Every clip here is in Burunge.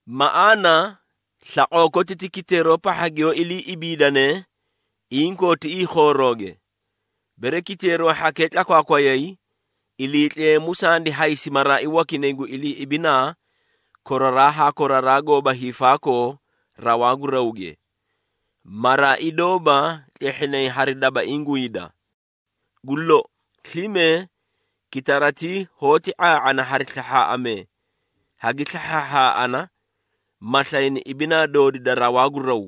Maꞌaana slaqoo koti ti kiteero pahha giyoó ilii ibiidane inkoo tiꞌii khoorooge. Bere kiteero hhakee tlakwaakwayay, Iliitleemu sandi haysi maraai wakinay gu ilii ibinaa koraraa haa koraraa goóba hiifaakoo rawaa gu rawge. Maraai doóba tlehhinay hari dabaiĩ gu hida. Gu lou, slime kitaratii hoóti ⁄aa⁄ana hari slahhaaꞌamee, hagi slahhaahhaaꞌana ma slayni ibinaa doori da rawaa gu raw.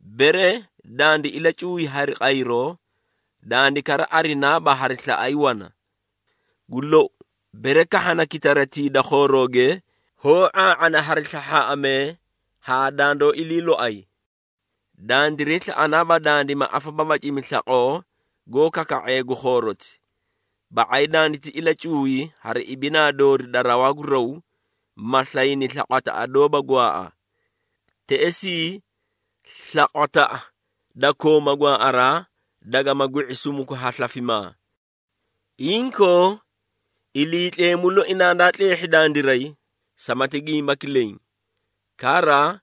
Bere dandi ilacuuy hari qayroo, dandi kara arinaaba hari slaꞌay wana. Gu lou, bere kahhana kitaratii da khoorooge, hoó ⁄aa⁄ana hari slahhaaꞌamee haa dandoó ilii loay. Dandiray slaꞌanaaba dandima afababacimi slaqoo goó kaka⁄ee gu khooroti, ba⁄ay danditi ilacuuy hari ibinaa doori da rawaa gu raw, ma slayni slaqwataꞌa doóba gwaaꞌa. Teꞌesii slaqwataꞌa da kooma gwaaꞌaraa, dagama gwi⁄i sumuku ha slafimaa. Inkoo, Iliitleemu loi nandaa tleehhi dandiray samati gimbaki leẽ. Kara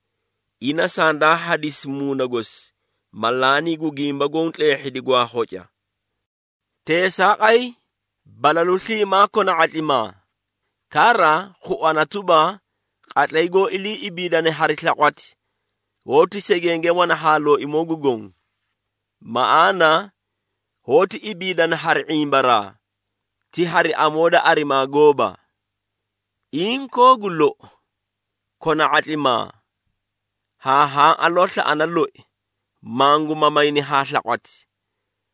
ina sandaa hadisi Muuna gosi, ma laanii gu gimba goõ tleehhidi gwaa khoca. Teesaaqay, balalu sliimaa kona ⁄atlimaa. Kara khuana tuba, qatlay goó ilii ibiidane hari slaqwati, hoóti segenge wana haa Looimoo gu Goõ. Maꞌaana, hoóti ibiidana hari ⁄imbaraa, ti hari amoo da arimaa gooba. Inkoo gu lou, kona ⁄atlimaa, haa haã aloo slaꞌana loi, mangu mamayni haa slaqwati,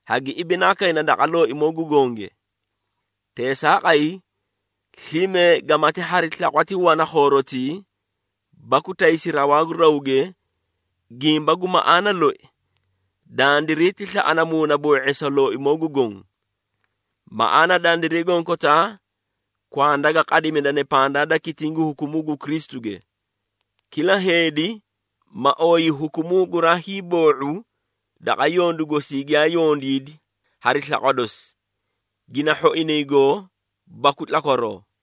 hagi ibinaa kayna daqa Looimoo gu Gonge. Teesaaqay, slime gamati hari slaqwati wana khoorotii, baku taysi rawaa gu rawge, gimba gu maꞌaana loi, dandiray ti slaꞌana muunaboo⁄eesa Looimoo gu Goõ. Maꞌaana dandiray gonkotaa kwanda ga qadimidane pandaa da kitiĩ gu hukumuu gu Kristuge. Kila heedi, ma ooyi hukumuu guraa hiiboo⁄u daqa yondu gosii giyaa yondiidi hari slaqwa dosi, gina hhoinay goo baku tlakwaroo.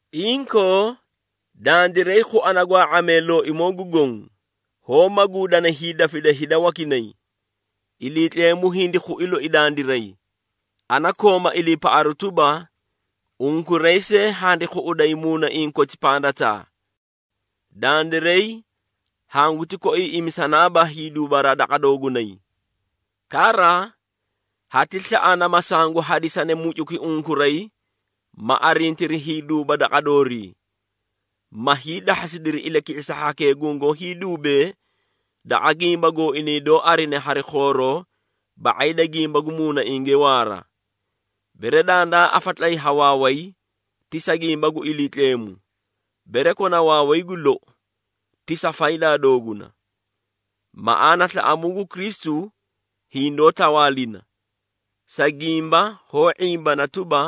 Inkoo, dandiray khuana gwaa⁄amee Looimoo gu Goõ, hoó maguudana hiidafida hida wakinay. Iliitleemu hindi khui loi dandiray, ana kooma iliipaꞌaru tuba, unkuray see handi khuꞌuday muunaiĩ koti pandataa. Dandiray hanguti koiiꞌimisanaaba hiiduubaraa daqa doogunay. Kara, hati slaꞌana, ma sangu hadisani mucuki unkuray, ma arintiri hiiduuba daqa doorii, ma hiidahhasidiri ilaki⁄isa hhakee gungoó hiiduubee daqa gimba gooinay doó arine hari khooroo ba⁄ay da gimba gu muunainge waara. Bere dandaa afatlayi ha waaway, ti sa gimba gu Iliitleemu, bere kona waaway gu lou, ti sa faydaa dooguna. Maꞌaana slaꞌamuu gu Kristu hindoó tawaalina, sa gimba hoó ⁄imbana tuba,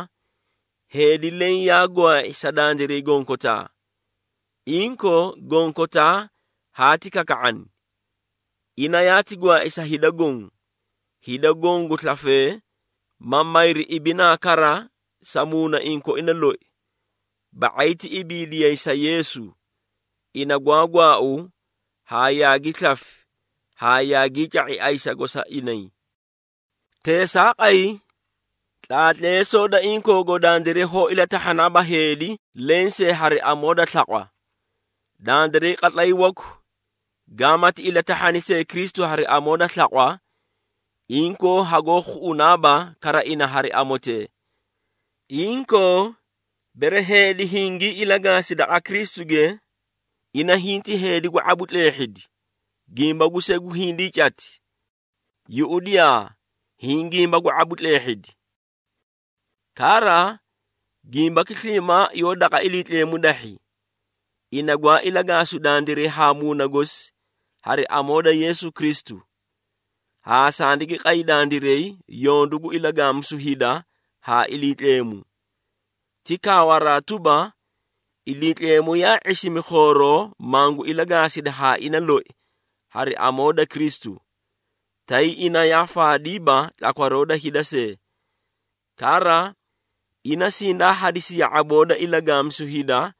heedi leẽ yaa gwaai sa dandiray gonkotaa, inkoo gonkotaa haati kaka⁄ani. Ina yaati gwaai sa hida goõ, hida goõ gu slafee ma mayri ibinaa kara sa muunaiĩ koina loi. Ba⁄ay ti ibiidiyay sa Yeesu, ina gwaa gwaau haa yaagi slafi haa yaagii ca⁄i ayisago sa inay. Teesaaqay, tlaatleesoo da inkoogo dandiray hoó ilatahhanaaba heedi lensee hari amoo da slaqwa. Dandiray qatlay waku, gamaati ilatahhani see Kristu hari amoo da slaqwa, inkoo hagoó khuꞌunaaba kara ina hari amotee. Inkoo, bere heedi hingii ilagaasi daqa Kristuge, ina hinti heedi gu ⁄abu tleehhidi, gimba gu segu hindii cati. Yuꞌudiyaa! Hiĩ gimba gu ⁄abu tleehhidi. Kara, gimbaki sliimaa yoó daqa Iliitleemu dahhi, ina gwaa ilagaasu dandiray haa muuna gosi hari amoo da Yeesu Kristu, haa sandigi qay dandiray yondu gu ilagaamisu hida haa Iliitleemu. Ti kaawaraa tuba, Iliitleemu yaa ⁄isimi khooroo mangu ilagaasidi haa ina loi hari amoo da Kristu, tay ina yaa faadiiba tlakwaroo da hida see. Kara, ina sindaa hadisi ya⁄aboo da ilagaamisu hida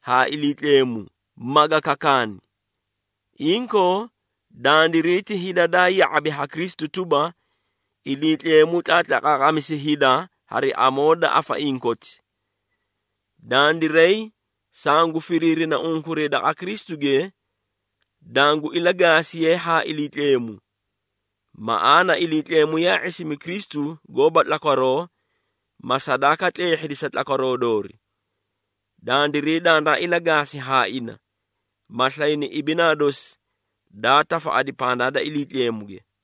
haa Iliitleemu, maga kakaani. Inkoo, dandiray ti hida daa ya⁄abi ha Kristu tuba, Iliitleemu tlaatlaqaaqamisi hida hari amoo da afaiĩ koti. Dandiray sangu firiirina unkuray daqa Kristuge, dangu ilagaasiye haa Iliitleemu. Maꞌaana Iliitleemu yaa ⁄isimi Kristu goóba tlakwaroo, ma sadaaka tleehhidi sa tlakwaroo doori. Dandiray danda ilagaasi haa ina, ma slayni ibinaa dosi daa tafaꞌadi pandaa da Iliitleemuge.